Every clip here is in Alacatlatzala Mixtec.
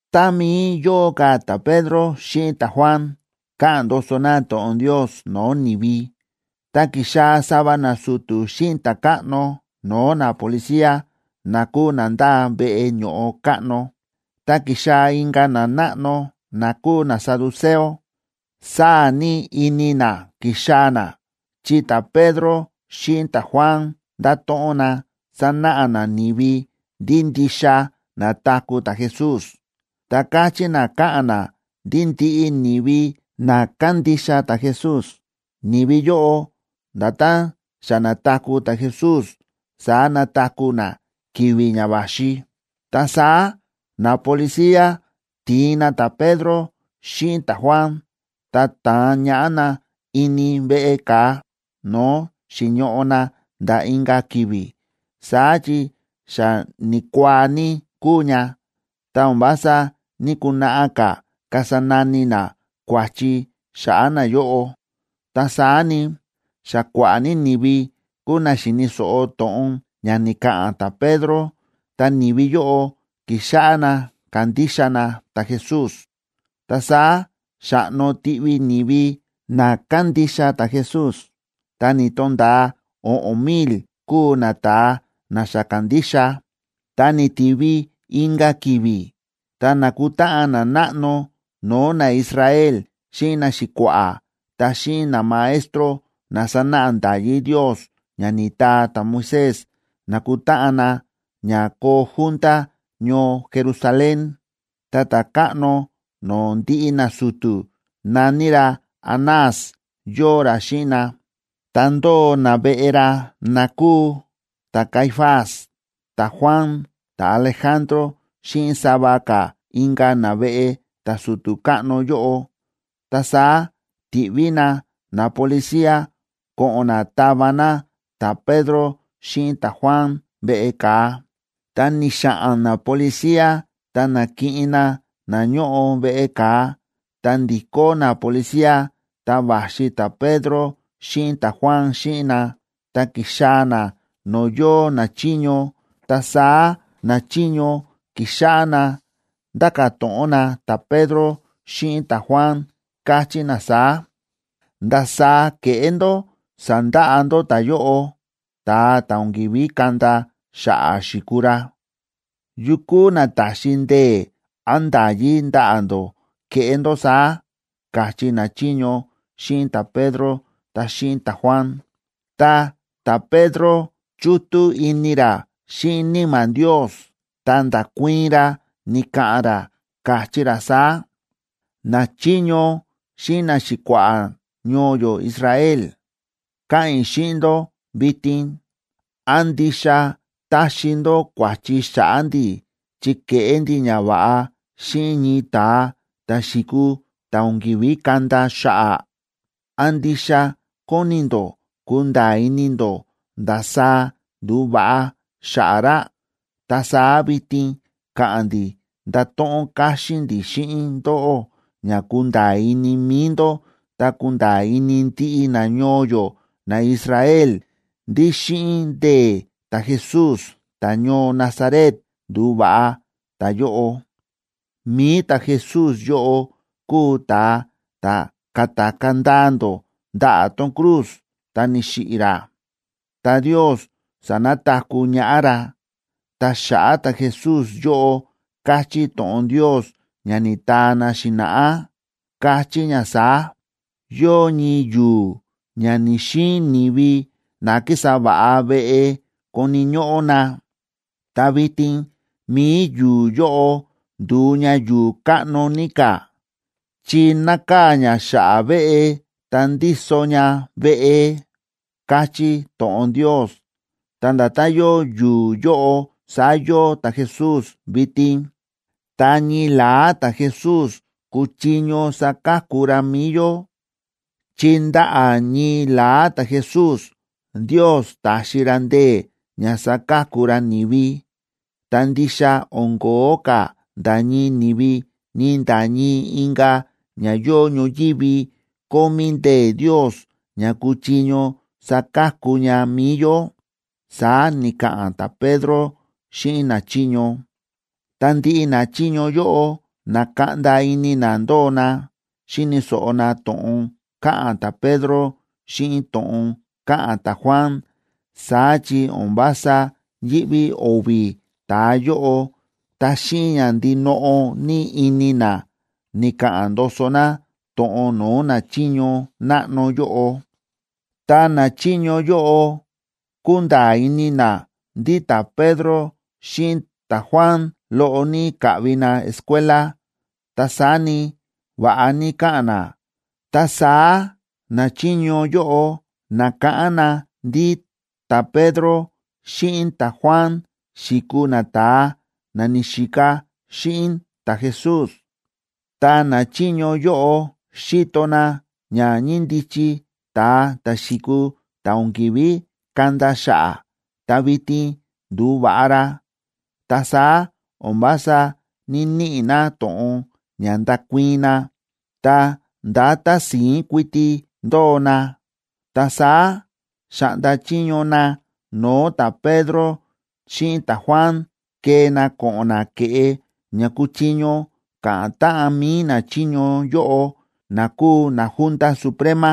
Tá mií yóo ka̱ ta̱Pedro xíꞌin ta̱Juan, káꞌa̱n ndoso na to̱ꞌon Ndios no̱o̱ ni̱vi, ta ki̱xaa̱ sava nasu̱tu̱ xíꞌin ta̱káꞌno no̱o̱ napolicía na kúu na ndáa veꞌe ño̱ꞌo káꞌno, ta ki̱xaa̱ inka̱ nanáꞌno na kúu nasaduceo. Sáa̱ ní ini na ki̱xaa̱ na, chi ta̱Pedro xíꞌin ta̱Juan ndáto̱ꞌon na sánáꞌa na ni̱vi ndí ndixa na̱taku̱ ta̱Jesús, ta káchí na káꞌa̱n na ndí ndiꞌi ni̱vi na kándixa ta̱Jesús, ni̱vi yóꞌo, nda̱tán xa na̱taku̱ ta̱Jesús saá nataku̱ na ki̱vi̱ ña va̱xi. Ta saá napolicía ti̱in na ta̱Pedro xíꞌin ta̱Juan, ta ta̱an ñaꞌá na ini veꞌe ka̱a, no̱o̱ xi̱ñoꞌo na nda̱ inka̱ ki̱vi̱, saá chi xa ni̱kuaa ní kúu ña, ta o̱n vása ní‑kunaꞌa ka̱ kasa nani na kua̱chi xa̱ꞌa̱ nayóꞌo. Ta saá ni, xa kua̱ꞌa̱ ní ni̱vi kúu na xi̱ni̱ so̱ꞌo to̱ꞌon ña ni̱ka̱ꞌa̱n ta̱Pedro, ta ni̱vi yóꞌo ki̱xáꞌá na kándixa na ta̱Jesús. Ta saá xa̱ꞌno tiꞌvi ni̱vi na kándixa ta̱Jesús, ta ni̱to̱nda̱a o̱ꞌo̱n mil kúu nata̱a na xa ka̱ndixa. Ta ni̱tivi inka̱ ki̱vi̱, ta na̱kutáꞌan nanáꞌno no̱o̱ naIsrael xíꞌin naxi̱kua̱ꞌa̱ ta xíꞌin namaestro na sánáꞌa nda̱yí Ndios ña ni̱taa ta̱Moisés, na̱kutáꞌan na ña koo junta ñoo Jerusalén. Ta ta̱káꞌno no̱o̱ ndiꞌi nasu̱tu̱, na̱ní ra Anás yóo ra xíꞌin na. Ta ndóo naveꞌe ra na kúu ta̱Caifás, ta̱Juan, ta̱Alejandro xíꞌin sava ka̱ inka̱ naveꞌe ta̱su̱tu̱ káꞌno yóꞌo. Ta saá ti̱ꞌví na napolicía ko̱ꞌo̱n na tava na ta̱Pedro xíꞌin ta̱Juan veꞌe ka̱a. Ta ni̱xa̱ꞌa̱n napolicía ta na̱kiꞌin na na ñóꞌo veꞌe ka̱a, ta ndi̱kó napolicía, ta va̱xi ta̱Pedro xíꞌin ta̱Juan xíꞌin na, ta ki̱xaa̱ na no̱o̱ yóo nachiño. Ta saá nachiño ki̱xáꞌá na nda̱ka̱ to̱ꞌon na ta̱Pedro xíꞌin ta̱Juan, káchí na saá: ―¿Ndasaá ke̱ꞌé ndó sa̱ndaꞌa ndó ta̱yóꞌo, ta̱a ta̱ o̱n ki̱ví kanda xa̱ꞌa̱ xi̱kuu ra? ¿Yu kúu na ta̱xi ndee̱ án nda̱yí ndaꞌa̱ ndó keꞌé ndó saá? ―káchí nachiño xíꞌin ta̱Pedro ta xíꞌin ta̱Juan. Ta ta̱Pedro, chútú ini ra xíꞌin Níma̱ Ndios, ta nda̱kuii̱n ra ni̱ka̱ꞌa̱n ra, káchí ra saá: ―Nachiño xíꞌin naxi̱kua̱ꞌa̱ ñoo yó Israel, káꞌa̱n i̱ xíꞌin ndó vitin. ¿Án ndixa táxi ndó kua̱chi xa̱ꞌa̱ ndi̱ chi ke̱ꞌé ndi̱ ñava̱ꞌa xíꞌin ñii ta̱a ta̱ xi̱kuu ta̱ o̱n ki̱ví kanda xa̱ꞌa̱? ¿Án ndixa kóni ndó kunda̱a̱ ini ndó ndasaá ndu̱va̱ꞌa xa̱ꞌa̱ ra? Ta saá vitin káꞌa̱n ndi̱ ndáto̱ꞌon káxín ndi̱ xíꞌin ndóꞌó ña kunda̱a̱ ini mi̱i ndó ta kunda̱a̱ ini ndiꞌi nañoo yó naIsrael ndí xíꞌin ndee̱ ta̱Jesús ta̱ñoo Nazaret ndu̱va̱ꞌa ta̱yóꞌo. Mi̱i ta̱Jesús yóꞌo kúu ta̱a ta̱ ka̱takaa̱ ndaa ndó ndaꞌa̱ tón cruz, ta ni̱xiꞌi̱ ra, ta Ndios sa̱nataku̱ ñaꞌá ra. Ta xa̱ꞌa̱ ta̱Jesús yóꞌo káchí to̱ꞌon Ndios ña ni̱taa na xi̱na̱ꞌá, káchí ña saá: “Yóo ñii yu̱u̱ ña ni̱‑xiin ni̱vi na kísa va̱ꞌa veꞌe koni̱ ñóꞌó na, ta vitin mi̱i yu̱u̱ yóꞌo ndu̱u ña yu̱u̱ káꞌno ní ka̱, chi nákaa̱ ña xa̱ꞌa̱ veꞌe ta ndíso ña veꞌe”, káchí to̱ꞌon Ndios. Ta nda̱tán yóo yu̱u̱ yóꞌo, saá yóo ta̱Jesús vitin. Ta ñii la̱á ta̱Jesús kúchiño saka̱ku ra mi̱i yó, chi ndaꞌa̱ ñii la̱á ta̱Jesús Ndios ta̱xi ra ndee̱ ña saka̱ku ra ni̱vi. Ta ndixa o̱n ko̱ó ka̱ nda̱ ñii ni̱vi, ni nda̱ ñii inka̱ ña yóo ñoyívi kómí ndee̱ Ndios ña kúchiño saka̱ku ña mi̱i yó ―saá ni̱ka̱ꞌa̱n ta̱Pedro xíꞌin nachiño. Ta ndiꞌi nachiño yóꞌo, na̱kaꞌnda ini na ndóo na, xíni̱ so̱ꞌo na to̱ꞌon káꞌa̱n ta̱Pedro xíꞌin to̱ꞌon káꞌa̱n ta̱Juan. Saá chi o̱n vása yíꞌví o̱vi̱ ta̱a yóꞌo, ta xíꞌin ña ndinoꞌo ní ini na ni̱ka̱ꞌa̱n ndoso na to̱ꞌon no̱o̱ nachiño náꞌno yóꞌo. Ta nachiño yóꞌo kúnda̱a̱ ini na ndí ta̱Pedro xíꞌin ta̱Juan loꞌo ní ka̱ꞌvi na escuela, ta saá ni, va̱ꞌa ní káꞌa̱n na. Ta saá nachiño yóꞌo na̱káꞌán na ndí ta̱Pedro xíꞌin ta̱Juan xi̱kuu nata̱a na ni̱xika xíꞌin ta̱Jesús. Ta nachiño yóꞌo xíto na ña ñíndichi ta̱a ta̱ xi̱kuu ta̱ o̱n ki̱ví kanda xa̱ꞌa̱, ta vitin ndu̱va̱ꞌa ra. Ta saá o̱n vása ní‑niꞌi na to̱ꞌon ña ndakuii̱n na, ta ndá tási̱ín kuiti ndóo na. Ta saá xa̱ꞌnda chiño na no̱o̱ ta̱Pedro xíꞌin ta̱Juan kee na ko̱ꞌo̱n na ke̱ꞌe ña kuchiño ka̱ꞌa̱n táꞌan mi̱i nachiño yóꞌo na kúu naJunta Suprema.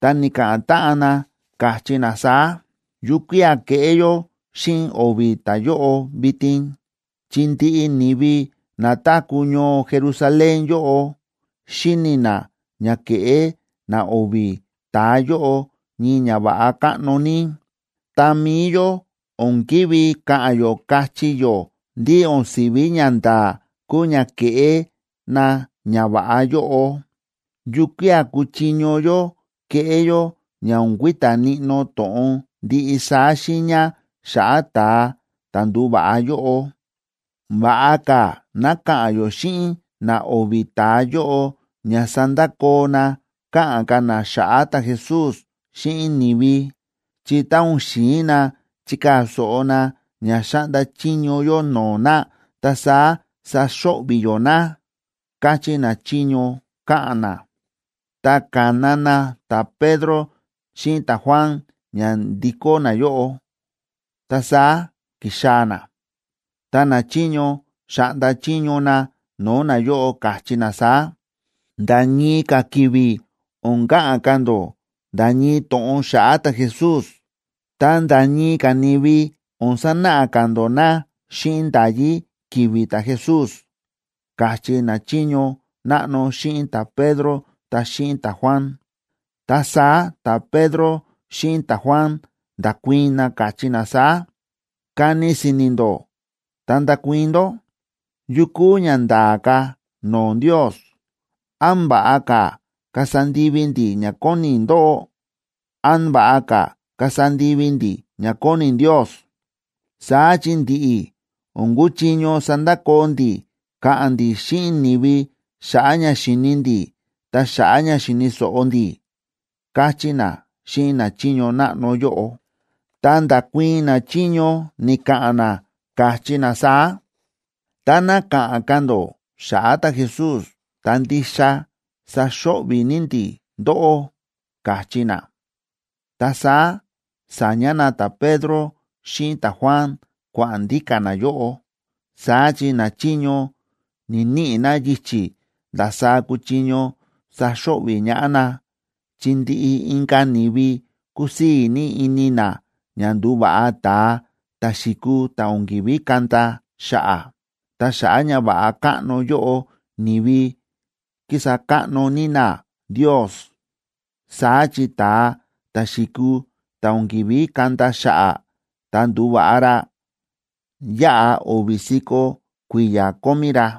Ta ni̱ka̱ꞌa̱n táꞌan na, káchí na saá: ―¿Yukía̱ keꞌé yó xíꞌin o̱vi̱ ta̱a yóꞌo vitin? Chi ndiꞌi ni̱vi na táku̱ ñoo Jerusalén yóꞌo xíni̱ na ña ke̱ꞌé na o̱vi̱ ta̱a yóꞌo ñii ñava̱ꞌa káꞌno ní. Ta mi̱i yó o̱n ki̱ví ka̱ꞌa̱n yó kachí yó ndí o̱n si̱ví ñanda̱a̱ kúu ña ke̱ꞌé na ñava̱ꞌa yóꞌo. ¿Yukía̱ kúchiño yó keꞌé yó ña o̱n kui̱ta̱ níꞌnó to̱ꞌon ndiꞌi saá xiiña xa̱ꞌa̱ ta̱a ta̱ ndu̱va̱ꞌa yóꞌo? Va̱ꞌa ka̱ ná ka̱ꞌa̱n yó xíꞌin na o̱vi̱ ta̱a yóꞌo ña sandakoo na káꞌa̱n ka̱ na xa̱ꞌa̱ ta̱Jesús xíꞌin ni̱vi, chi tá o̱n xi̱in na chikaa̱ so̱ꞌo na ña xáꞌnda chiño yó no̱o̱ na, ta saá saxo̱ꞌvi̱ yó na ―káchí nachiño, káꞌa̱n na. Ta ka̱na na ta̱Pedro xíꞌin ta̱Juan ña ndikó nayóꞌo. Ta saá ki̱xaa̱ na, ta nachiño xa̱ꞌnda chiño na no̱o̱ nayóꞌo, káchí na saá: ―Nda̱ ñii ka̱ ki̱vi̱ o̱n ka̱ꞌa̱n ka̱ ndó nda̱ ñii to̱ꞌon xa̱ꞌa̱ ta̱Jesús, ta nda̱ ñii ka̱ ni̱vi o̱n sanáꞌa ka̱ ndó na xíꞌin nda̱yí ki̱vi̱ ta̱Jesús ―káchí nachiño náꞌno xíꞌin ta̱Pedro ta xíꞌin ta̱Juan. Ta saá ta̱Pedro xíꞌin ta̱Juan nda̱kuii̱n na, káchí na saá: ―Kani si̱ni̱ ndó ta ndakuii̱n ndó, ¿yu kúu ña nda̱a̱ ka̱ no̱o̱ Ndios? ¿Án va̱ꞌa ka̱ kasa ndivi ndi̱ ña kóni ndóꞌó, án va̱ꞌa ka̱ kasa ndivi ndi̱ ña kóni Ndios? Saá chi ndi̱ꞌi̱, o̱n kúchiño sandakoo ndi̱ káꞌa̱n ndi̱ xíꞌin ni̱vi xa̱ꞌa̱ ña xi̱ni ndi̱, ta xa̱ꞌa̱ ña xi̱ni̱ so̱ꞌo ndi̱ ―káchí na xíꞌin nachiño náꞌno yóꞌo. Ta nda̱kuii̱n nachiño ni̱ka̱ꞌa̱n na, káchí na saá: ―Táná ka̱ꞌa̱n ka̱ ndó xa̱ꞌa̱ ta̱Jesús, ta ndixa saxo̱ꞌvi̱ ní ndi̱ ndóꞌó ―káchí na. Ta saá sa̱ña na ta̱Pedro xíꞌin ta̱Juan kua̱ꞌa̱n ndíka̱ nayóꞌo. Saá chi nachiño ni̱‑niꞌi na yichi̱ ndasaá kuchiño saxo̱ꞌvi̱ ñaꞌá na, chi ndiꞌi inka̱ ni̱vi kúsii̱ ní ini na ña ndu̱va̱ꞌa ta̱a ta̱ xi̱kuu ta̱ o̱n ki̱ví kanda xa̱ꞌa̱. Ta xa̱ꞌa̱ ñava̱ꞌa káꞌno yóꞌo, ni̱vi ki̱sa káꞌno ní na Ndios. Saá chi ta̱a ta̱ xi̱kuu ta̱ o̱n ki̱ví kanda xa̱ꞌa̱ ta ndu̱va̱ꞌa ra, yáꞌa o̱vi̱ si̱ko̱ kui̱ya̱ kómí ra.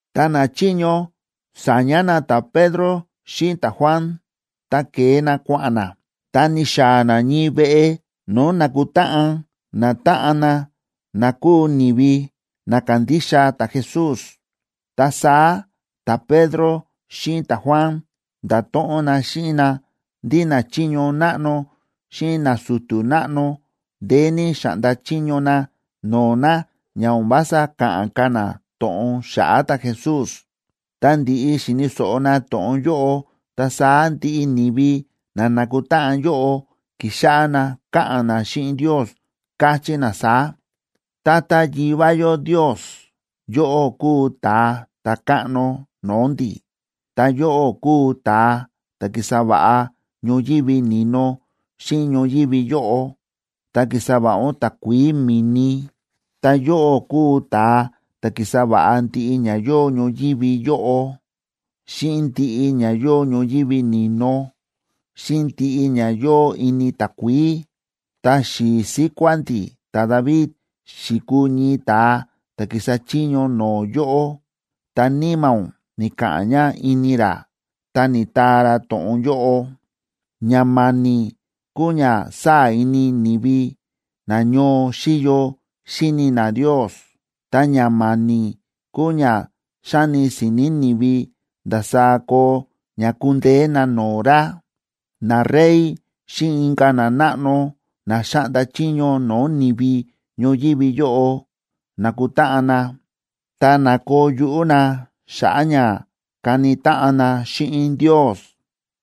Tá nachiño sa̱ña na ta̱Pedro xíꞌin ta̱Juan, ta ke̱e na kua̱ꞌa̱n na, ta ni̱xaa̱ na ñii veꞌe no̱o̱ nákutáꞌan natáꞌan na na kúu ni̱vi na kándixa ta̱Jesús. Ta saá ta̱Pedro xíꞌin ta̱Juan nda̱to̱ꞌon na xíꞌin na ndí nachiño náꞌno xíꞌin nasu̱tu̱ náꞌno ndeé ní xa̱ꞌnda chiño na no̱o̱ na ña o̱n vása ka̱ꞌa̱n ka̱ na to̱ꞌon xa̱ꞌa̱ ta̱Jesús. Tá ndi̱ꞌi xi̱ni̱ so̱ꞌo na to̱ꞌon yóꞌo, ta saá ndiꞌi ni̱vi na na̱kutáꞌan yóꞌo ki̱xáꞌá na káꞌa̱n na xíꞌin Ndios, káchí na saá: ―Tata Yivá yó Ndios, yóꞌó kúu Ta̱a Ta̱káꞌno no̱o̱ ndi̱, ta yóꞌó kúu ta̱a ta̱ ki̱sa va̱ꞌa ñoyívi ni̱no xíꞌin ñoyívi yóꞌo, ta ki̱sa va̱ꞌa ún takuií mi̱ni. Ta yóꞌó kúu ta̱a ta̱ ki̱sa va̱ꞌa ndiꞌi ña yóo ñoyívi yóꞌo, xíꞌin ndiꞌi ña yóo ñoyívi ni̱no, xíꞌin ndiꞌi ña yóo ini takuií. Ta xi̱i̱ síkuá ndi̱ ta̱David xi̱kuu ñii ta̱a ta̱ ki̱sa chiño no̱o̱ yóꞌó, ta Níma̱ ún ni̱ka̱ꞌa̱n ña ini ra, ta ni̱taa ra to̱ꞌon yóꞌo: Ña ma̱ni̱ kúu ña sáa̱ ini ni̱vi na ñoo xíyo xíni na Ndios, ta ña ma̱ni̱ kúu ña xáni si̱ni̱ ni̱vi ndasaá koo ña kundeé na no̱o̱ ra. Narey xíꞌin inka̱ nanáꞌno na xáꞌnda chiño no̱o̱ ni̱vi ñoyívi yóꞌo na̱kutáꞌan na, ta na̱koo yuꞌú na xa̱ꞌa̱ ña kani táꞌan na xíꞌin Ndios.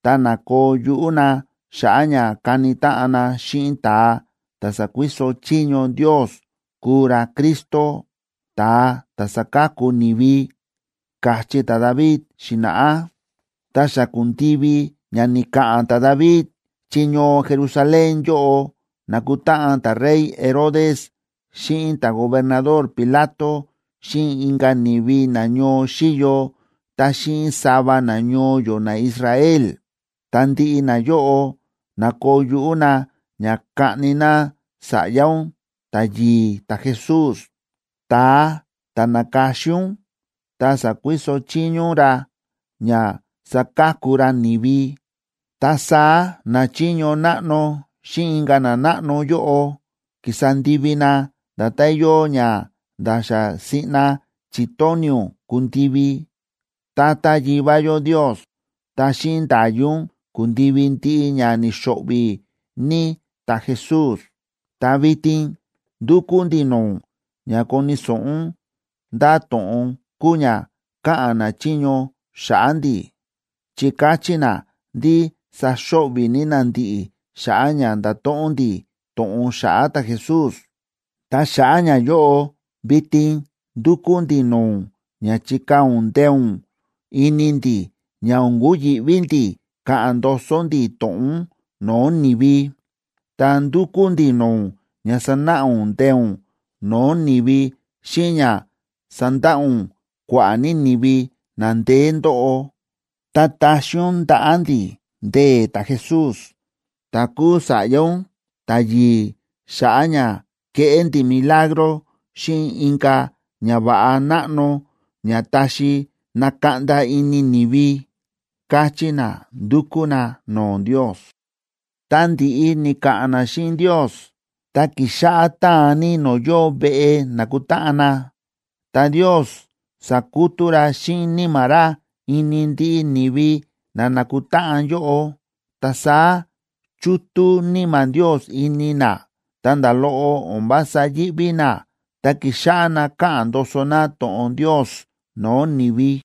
Ta na̱koo yuꞌú na xa̱ꞌa̱ ña kani táꞌan na xíꞌin ta̱a ta̱ sakuiso chiño Ndios kuu ra Cristo, ta̱a ta̱ saka̱ku ni̱vi, káchí ta̱David xi̱na̱ꞌá. ’Ta xa ku̱ndivi ña ni̱ka̱ꞌa̱n ta̱David, chi ñoo Jerusalén yóꞌo na̱kutáꞌan ta̱rey Herodes xíꞌin ta̱gobernador Pilato xíꞌin inka̱ ni̱vi na ñoo xíyo, ta xíꞌin sava nañoo yó naIsrael, ta ndiꞌi nayóꞌo na̱koo yuꞌú na ña kaꞌni na Sa̱ꞌya ún ta̱yi̱i̱ ta̱Jesús, ta̱a ta̱ na̱ka̱xin ún ta sa̱kuiso chiño ún ra ña saka̱ku ra ni̱vi. Ta saá nachiño náꞌno xíꞌin inka̱ nanáꞌno yóꞌo ki̱sa ndivi na nda̱tán yóo ña nda̱ xa siꞌna chi̱tóni̱ ún kundivi, Tata Yivá yó Ndios. Ta xíꞌin nda̱yí ún ku̱ndivi ndiꞌi ña ni̱xo̱ꞌvi̱ ní ta̱Jesús. Ta vitin ndúkú ndi̱ no̱o̱ ún ña koni̱ so̱ꞌo ún ndá to̱ꞌon kúu ña káꞌa̱n nachiño xa̱ꞌa̱ ndi̱, chi káchí na ndí saxo̱ꞌvi̱ ní na ndi̱ꞌi̱ xa̱ꞌa̱ ña ndato̱ꞌon ndi̱ to̱ꞌon xa̱ꞌa̱ ta̱Jesús. Ta xa̱ꞌa̱ ñayóꞌo, vitin ndúkú ndi̱ no̱o̱ ún ña chikaa̱ ún ndee̱ ún ini ndi̱ ña o̱n kuyi̱ꞌví ndi̱ ka̱ꞌa̱n ndoso ndi̱ to̱ꞌon ún no̱o̱ ni̱vi. Ta ndúkú ndi̱ no̱o̱ ún ña sanáꞌa ún ndee̱ ún no̱o̱ ni̱vi xíꞌin ña sandaꞌa ún kua̱ꞌa̱ ní ni̱vi na ndeé ndóꞌo. Ta taxi ún ndaꞌa̱ ndi̱ ndee̱ ta̱Jesús, ta̱ kúu Sa̱ꞌya ún ta̱yi̱i̱, xa̱ꞌa̱ ña keꞌé ndi̱ milagro xíꞌin inka̱ ñava̱ꞌa náꞌno ña taxi nakaꞌnda ini ni̱vi ―káchí na, ndu̱kú na no̱o̱ Ndios. Tá ndi̱ꞌi ni̱ka̱ꞌa̱n na xíꞌin Ndios, ta ki̱xáꞌá táan ní no̱o̱ yóo veꞌe nákutáꞌan na. Ta Ndios sa̱kutú ra xíꞌin Níma̱ ra ini ndiꞌi ni̱vi na na̱kutáꞌan yóꞌo. Ta saá chútú Níma̱ Ndios ini na, ta nda̱ loꞌo o̱n vása yíꞌví na, ta ki̱xáꞌá na káꞌa̱n ndoso na to̱ꞌon Ndios no̱o̱ ni̱vi.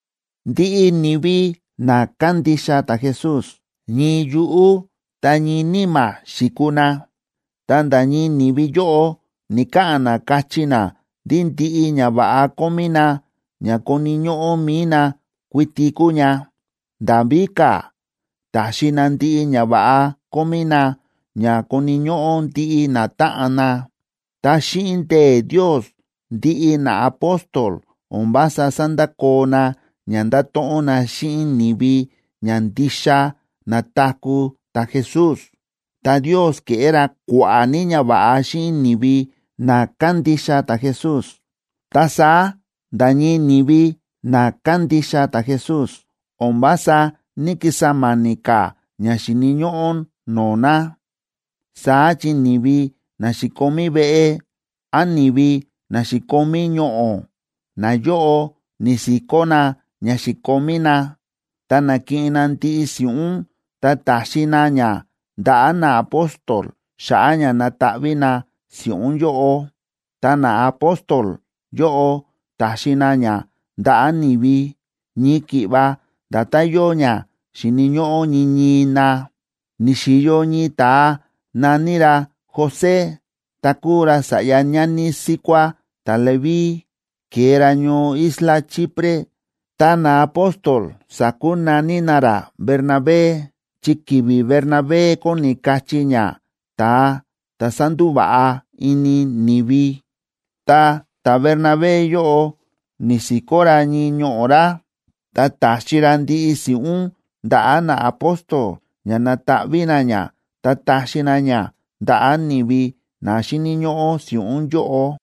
Ndiꞌi ni̱vi na kándixa ta̱Jesús, ñii yuꞌú ta ñii níma̱ xi̱kuu na, ta nda̱ ñii ni̱vi yóꞌo ni̱ka̱ꞌa̱n na káchí na ndí ndiꞌi ñava̱ꞌa kómí na ña koni̱ ñóꞌó mi̱i na kuiti kúu ña. Nda̱ víka̱, ta̱xi na ndiꞌi ñava̱ꞌa kómí na, ña koni̱ ñóꞌó ndiꞌi natáꞌan na. Ta xíꞌin ndee̱ Ndios, ndiꞌi naapóstol o̱n vása sándakoo na ña ndato̱ꞌon na xíꞌin ni̱vi ña ndixa na̱taku̱ ta̱Jesús. Ta Ndios ke̱ꞌé ra kua̱ꞌa̱ ní ñava̱ꞌa xíꞌin ni̱vi na kándixa ta̱Jesús. Ta saá nda̱ ñii ni̱vi na kándixa ta̱Jesús o̱n vása ní‑kisa ma̱ni̱ ka̱ ña xíni̱ ñóꞌó no̱o̱ na. Saá chi ni̱vi na xi̱komí veꞌe, án ni̱vi na xi̱komí ñoꞌo̱, nayóꞌo ni̱si̱kó na ña xi̱komí na, ta na̱kiꞌin na ndiꞌi si̱ꞌún, ta ta̱xi na ña ndaꞌa̱ naapóstol xa̱ꞌa̱ ña nataꞌví na si̱ꞌún yóꞌo. Ta naapóstol yóꞌo ta̱xi na ña ndaꞌa̱ ni̱vi, ñii ki̱ꞌva nda̱tán yóo ña xíni̱ ñóꞌó ñii ñii na. Ni̱xi̱yo ñii ta̱a na̱ní ra José, ta̱ kúu ra sa̱ꞌya ñani síkuá ta̱Leví. Ke̱e ra ñoo isla Chipre, ta naapóstol sa̱kunaní na ra Bernabé, chi ki̱vi̱ Bernabé kóni kachí ña: Ta̱a ta̱ sándúva̱ꞌa ini ni̱vi. Ta ta̱Bernabé yóꞌo ni̱si̱kó ra ñii ñoꞌo̱ ra, ta ta̱xi ra ndiꞌi si̱ꞌún ndaꞌa̱ naapóstol ña nataꞌví na ña ta taxi na ña ndaꞌa̱ ni̱vi na xíni̱ ñóꞌó si̱ꞌún yóꞌo.